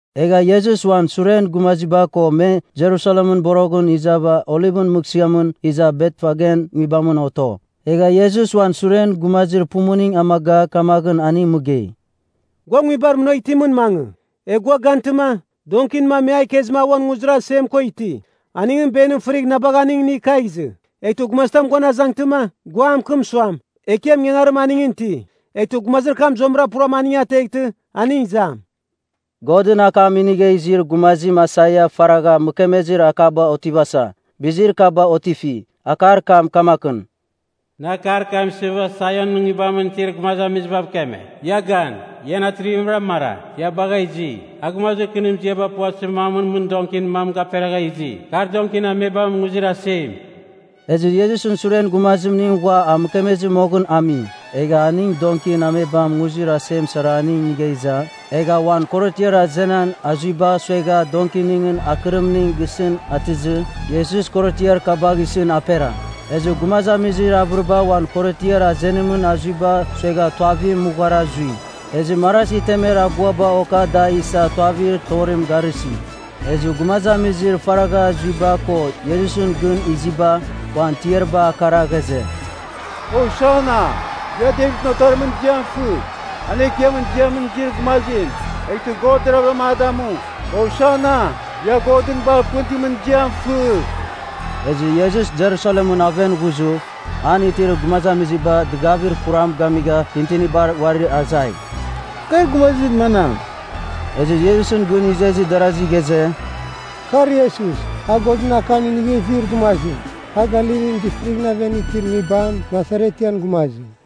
Egha Iesus uan suren gumaziba ko me Jerusalemɨn boroghɨn izava Olivɨn Mɨghsɨamɨn iza Betfagen nguibamɨn oto. Egha Iesus uan suren gumazir pumuning amaga, kamaghɨn aning mɨgei, “Gua nguibar munagh itimɨn mangɨ, egh gua gantɨma, donkin mam me a ikezɨma a uan nguzir asem ko iti. Aningɨn benim fɨrigh na bagh aning inigh kagh izɨ. Eghtɨ gumazitam guan azangtɨma, gua a mɨkɨm suam, ‘Ekiam ingangarim aningɨn iti.’ Eghtɨ gumazir kam zuamɨra puram aning ateghtɨ, aning izam.” Godɨn akam inigha izir gumazim Aisaia faragha mɨkemezir akaba otivasa, bizir kaba otifi. Akar kam kamakɨn, “Nɨ akar kam isɨva Saionɨn nguibamɨn itir gumazamizibav keme. Ia gan, ian atrivimra mara, ia bagha izi! A gumazir kɨnir ziaba puvatɨzir mamɨn mɨn donkin mam gaperagha izi, kar donkin amebamɨn nguzir asem.” Ezɨ Iesusɨn suren gumazimning ghua a mɨkemezɨ moghɨn ami. Egha aning donkin amebam nguzir asem sara aning inigha iza, egha uan korotiar azenan azuiba suegha donkiningɨn akɨrimning gisɨn atɨzɨ, Iesus korotiar kabagh isɨn apera. Ezɨ gumazamizir avɨriba uan korotiar azenimɨn azuiba suegha tuavim mughara zui. Ezɨ marazi temer aguaba oka da isa tuavir torim garɨsi. Ezɨ gumazamizir faragha zuiba ko Iesusɨn gɨn iziba, uan tiariba akara ghaze, “Hosana! Ia Devitɨn Otarimɨn ziam fɨ. An Ekiamɨn ziamɨn izir gumazim, eghtɨ God deravɨra a damu. Hosana! Ia Godɨn bar pɨn itimɨn ziam fɨ!” Ezɨ Iesus Jerusalemɨn aven ghuzɨ, an itir gumazamiziba dɨgavir kuram gamigha tintinibar uarir azai, “Kar gumazir manam?” Ezɨ Iesusɨn gɨn izezir darazi ghaze, “Kar Iesus, a Godɨn akam inigha izir gumazim. A Galilin Distrighɨn aven itir nguibam Nasaretian gumazim.”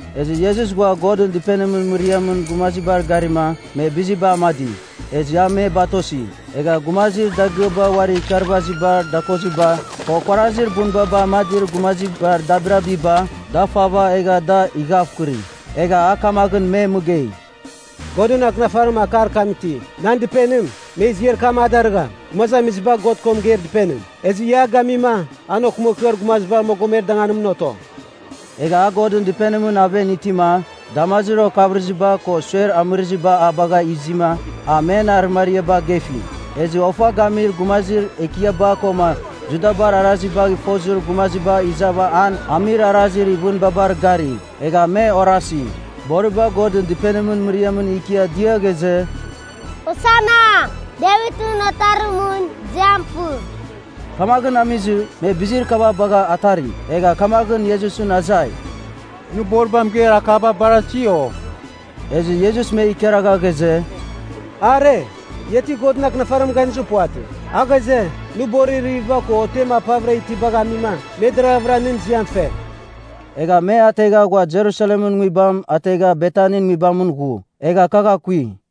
Ezɨ Iesus ghua Godɨn Dɨpenimɨn mɨriamɨn gumazibar garima, me biziba amadi, ezɨ a me batosi. Egha gumazir dagɨaba uarir ikarvazibar dakoziba, ko kuarazir bunbaba amadir gumazibar dabirabiba, da fava egha da ighavkɨri. Egha a kamaghɨn me mɨgei, “Godɨn Akɨnafarim akar kam iti. ‘Nan dɨpenim, me ziar kam a darɨgham, Gumazamiziba God ko Mɨgeir Dɨpenim. Ezɨ ia a gamima, an okɨmakɨar gumazibar mogomer danganimɨn oto!’” Egha a Godɨn Dɨpenimɨn aven itima, damazir okavɨrɨziba ko suer amɨrɨziba a bagha izima, a men arɨmariaba gefi. Ezɨ ofa gamir gumazir ekiaba koma Judabar arazibagh fozir gumaziba izava an amir arazir ivɨnbabar gari. Egha me orasi, boriba Godɨn Dɨpenimɨn mɨriamɨn ikia dia ghaze, “Hosana! Devitɨn Otarimɨn ziam fɨ.” Kamaghɨn amizɨ, me bizir kaba bagha atari. Egha kamaghɨn Iesusɨn azai, “Nɨ boriba mɨgeir akaba barasi, o?” Ezɨ Iesus me ikaragha ghaze, “Are, ia ti Godɨn Akɨnafarimɨn ganizir puvatɨ? A ghaze, ‘Nɨ borir iririviba ko otem apavɨra itibagh amima, me deravɨra nɨn ziam fe.’” Egha me ategha ghua Jerusalemɨn nguibam ategha Betanin nguibamɨn ghu, egha kagh akui.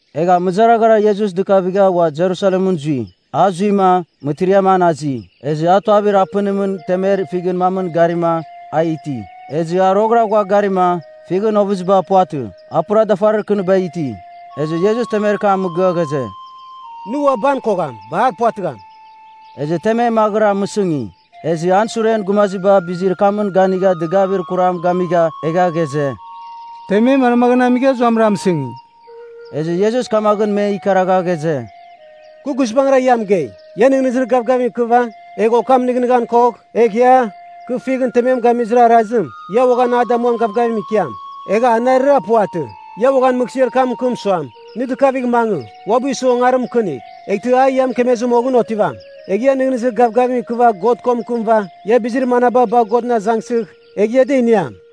Egha mɨzaraghara Iesus dɨkavigha ua Jerusalemɨn zui. A zuima, mɨtiriam an azi, ezɨ a tuavir apɨnimɨn temer fighɨn mamɨn garima, a iti. Ezɨ a roghɨra ghua garima, fighɨn ovɨziba puvatɨ. A pura dafarir kɨniba iti. Ezɨ Iesus temer kam mɨgɨa ghaze, “Nɨ ua ban kogham. Bar puvatɨgham.” Ezɨ temem maghɨra mɨsɨngi. Ezɨ an suren gumaziba bizir kamɨn ganigha dɨgavir kuram gamigha, egha ghaze, “Temem manmaghɨn amigha zuamɨra mɨsɨngi?” Ezɨ Iesus kamaghɨn me ikaragha ghaze, “Kɨ guizbangɨra ia mɨgei, ia nɨghnɨzir gavgavim ikɨva, egh okam nɨghnɨghan kogh, egh ia, kɨ fighɨn temem gamizir arazim, ia uaghan a damuamin gavgavim ikiam. Egha anarɨra puvatɨ, ia uaghan mɨghsɨar kam mɨkɨm suam, ‘Nɨ dɨkavigh mangɨ, uabɨ isɨ ongarim mɨkɨnigh.’ Eghtɨ a ia mɨkemezir moghɨn otivam. Egh ia nɨghnɨzir gavgavim ikɨva God ko mɨkɨmɨva, ia bizir manaba bagh Godɨn azangsɨgh, egh ia da iniam.”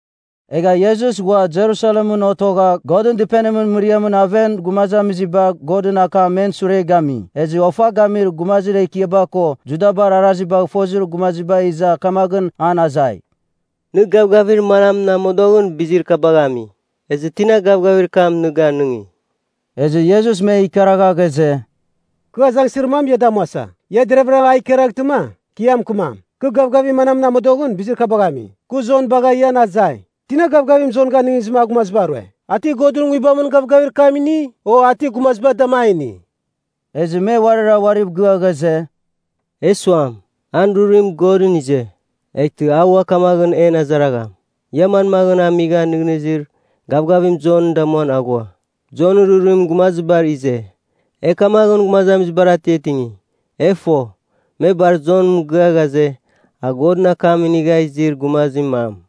Egha Iesus ghua Jerusalemɨn otogha Godɨn Dɨpenimɨn mɨriamɨn aven gumazamiziba Godɨn akam men sure gami. Ezɨ ofa gamir gumazir ekiaba ko Judabar arazibagh fozir gumaziba iza kamaghɨn an azai, “Nɨ gavgavir manamɨn amodoghɨn bizir kabagh ami? Ezɨ tina gavgavir kam nɨ ganɨngi?” Ezɨ Iesus me ikaragha ghaze, “Kɨ azangsɨzir mam ia damuasa. Ia deravɨra a ikaraghtɨma, kɨ ia mɨkɨmam, kɨ gavgavir manamɨn amodoghɨn bizir kabagh ami. Kɨ Jon bagha ian azai, tina gavgavim Jon ganɨngizɨ a gumaziba rue? A ti Godɨn Nguibamɨn gavgavir kam ini, o a ti gumaziba dama a ini?” Ezɨ me uarira uariv gɨa ghaze, “E suam, ‘An rurim Godɨn ize,’ eghtɨ a ua kamaghɨn en azaragham, ‘Ia manmaghɨn amigha nɨghnɨzir gavgavim Jon damuan aghua?’ Eghtɨ e suam, ‘Jonɨn rurim gumazibar ize,’ e kamaghɨn gumazamizibar atiatingi. E fo, me bar Jon mɨgɨa ghaze, a Godɨn akam inigha izir gumazir mam.”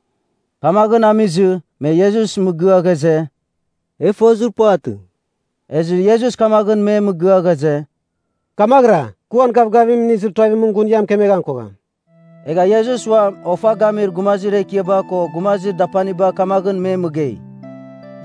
Kamaghɨn amizɨ, me Iesus mɨgɨa ghaze, “E fozir puvatɨ.” Ezɨ Iesus kamaghɨn me mɨgɨa ghaze, “Kamaghɨra, kɨ uan gavgavim inizir tuavimɨn, gun ia mɨkemeghan kogham.” Egha Iesus uam ofa gamir gumazir ekiaba ko gumazir dapaniba kamaghɨn me mɨgei,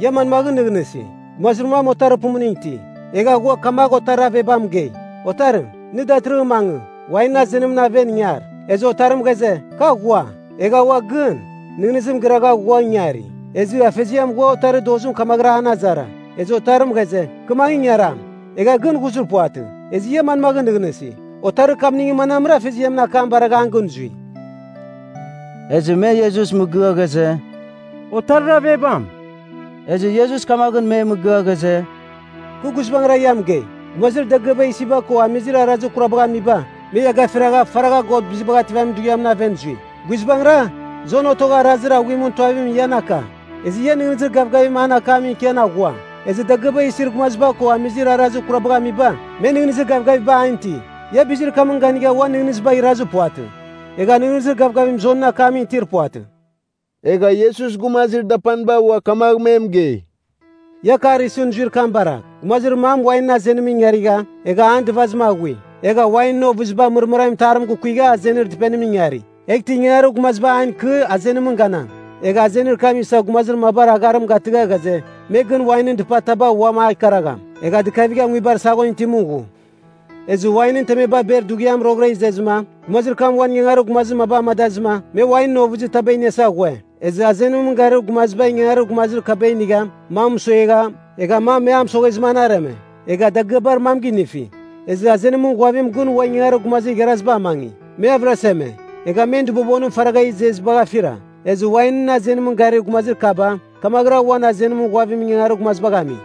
“Ia manmaghɨn nɨghnɨsi? Gumazir mam otarir pumuning iti. Egha ghua kamagh otarir avebam mɨgei, ‘Otarim, nɨ datɨrɨghɨn mangɨ, wainɨn azenimɨn aven ingar.’ Ezɨ otarim ghaze, ‘Kɨ aghua.’ Egha ua gɨn, nɨghnɨzim gɨragha ghua ingari. Ezɨ afeziam ghua otarir dozim kamaghɨra an azara. Ezɨ otarim ghaze, ‘Kɨ mangɨ, ingaram.’ Egha gɨn ghuzir puvatɨ. Ezɨ ia manmaghɨn nɨghnɨsi, otarir kamningɨn manamra afeziamɨn akam baragha an gɨn zui?” Ezɨ me Iesus mɨgɨa ghaze, “Otarir avebam.” Ezɨ Iesus kamaghɨn me mɨgɨa ghaze, “Kɨ guizbangɨra ia mɨgei, gumazir dagɨaba isiba ko amizir arazir kurabagh amiba, me ia gafiragha faragha God Bizibagh Ativamin Dughiamɨn aven zui. Guizbangɨra, Jon otogha arazir aghuimɨn tuavim ian aka, ezɨ ia nɨghnɨzir gavgavim an akamɨn ikian aghua. Ezɨ dagɨaba isir gumaziba ko amizir arazir kurabagh amiba, me nɨghnɨzir gavgaviba an iti. Ia bizir kamɨn ganigha uan nɨghnɨzibagh irazir puvatɨ, egha nɨghnɨzir gavgavim Jonɨn akamɨn itir puvatɨ.” Egha Iesus gumazir dapaniba ua kamagh me mɨgei, “Ia akar isɨn zuir kam baragh. Gumazir mam wainɨn azenimɨn ingarigha, egha an dɨvazim aghui. Egha wainɨn ovɨziba mɨrmɨramin itarim gukuigha azenir dɨpenimɨn ingari, eghtɨ ingangarir gumaziba an ikɨ azenimɨn ganam. Egha azenir kam isa gumazir mabar agharim gatɨgha ghaze, me gɨn wainɨn dɨpataba uam a ikaragham. Egha dɨkavigha nguibar saghon itimɨn ghu. Ezɨ wainɨn temeba ber dughiam roghɨra izezɨma, gumazir kam uan ingangarir gumazir maba amadazɨma, me wainɨn ovɨzi taba iniasa ghue. Ezɨ azenimɨn garir gumaziba ingangarir gumazir kaba inigha, mam mɨsuegha, egha mam me a mɨsoghezɨma an areme, egha dagɨaba mam ginifi. Ezɨ azenimɨn ghuavim gɨn ua ingangarir gumazir igharaziba amangi. Me avɨraseme, egha men dɨbobonim faragha izezibagh afira. Ezɨ wainɨn azenimɨn garir gumazir kaba kamaghɨra uam azenimɨn ghuavimɨn ingangarir gumazibagh ami.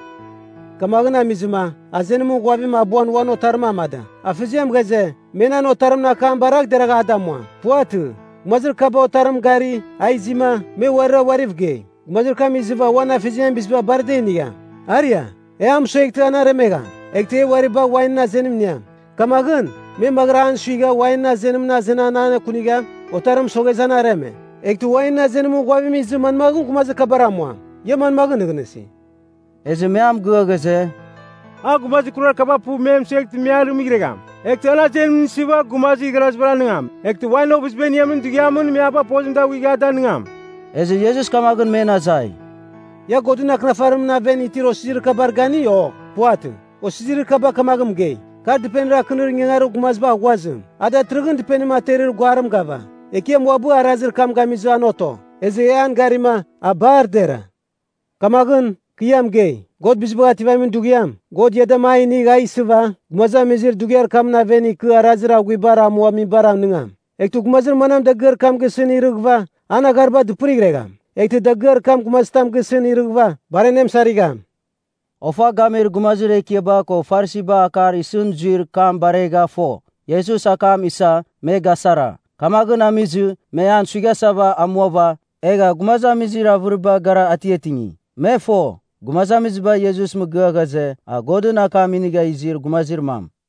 “Kamaghɨn amizɨma, azenimɨn ghuavim abuan uan otarim amada. Afeziam ghaze, ‘Me nan otarimɨn akam baragh deragh a damuam.’ Puvatɨ, gumazir kaba otarimɨn gari, a izima, me uarira uariv gei, ‘Gumazir kam izɨva uan afeziamɨn biziba bar da inigham. Aria. E a mɨsueghtɨ, an aremegham. Eghtɨ e uari bagh wainɨn azenim iniam.’ Kamaghɨn, me maghɨra an suigha, wainɨn azenimɨn azenan anekunigha, otarim mɨsoghezɨ an areme. “Eghtɨ wainɨn azenimɨn ghuavim izɨ manmaghɨn gumazir kabar amuam? Ia manmaghɨn nɨghnɨsi?” Ezɨ me a mɨgɨa ghaze, “A gumazir kurar kaba puv me mɨsueghtɨ me arɨmɨghregham. Eghtɨ an azenim isɨva gumazir igharazibar anigam, eghtɨ wainɨn ovɨziba iniamin dughiamɨn me a bagh pozim daghuigh a danɨngam.” Ezɨ Iesus kamaghɨn men azai, “Ia Godɨn Akɨnafarimɨn aven itir osizirir kabar gani, o puvatɨ? Osizirir kaba kamaghɨn mɨgei, ‘Kar dɨpenir akɨnir ingangarir gumaziba aghuazim, a datɨrɨghɨn dɨpenim aterir guarim gava. Ekiam uabɨ arazir kam gamizɨma an oto. Ezɨ e an garima, a bar dera.’ “Kamaghɨn, kɨ ia mɨgei, God Bizibagh Ativamin Dughiam, God ia dama a inigh a isɨva, gumazamizir dughiar kamɨn aven ikɨ arazir aghuibar amuamibar anɨngam. Eghtɨ gumazir manam dagɨar kam gisɨn irɨghɨva, an aghariba dɨpɨrighregham. Eghtɨ dagɨar kam gumazitam gisɨn irɨghɨva, bar anemɨsarigham.” Ofa gamir gumazir ekiaba ko Farisiba akar isɨn zuir kam baregha fo, Iesus akam isa, me gasara. Kamaghɨn amizɨ, me an suighasava amuava, egha gumazamizir avɨribar gara atiatingi. Me fo, gumazamiziba Iesusɨn mɨgɨa ghaze, a Godɨn akam inigha izir gumazir mam.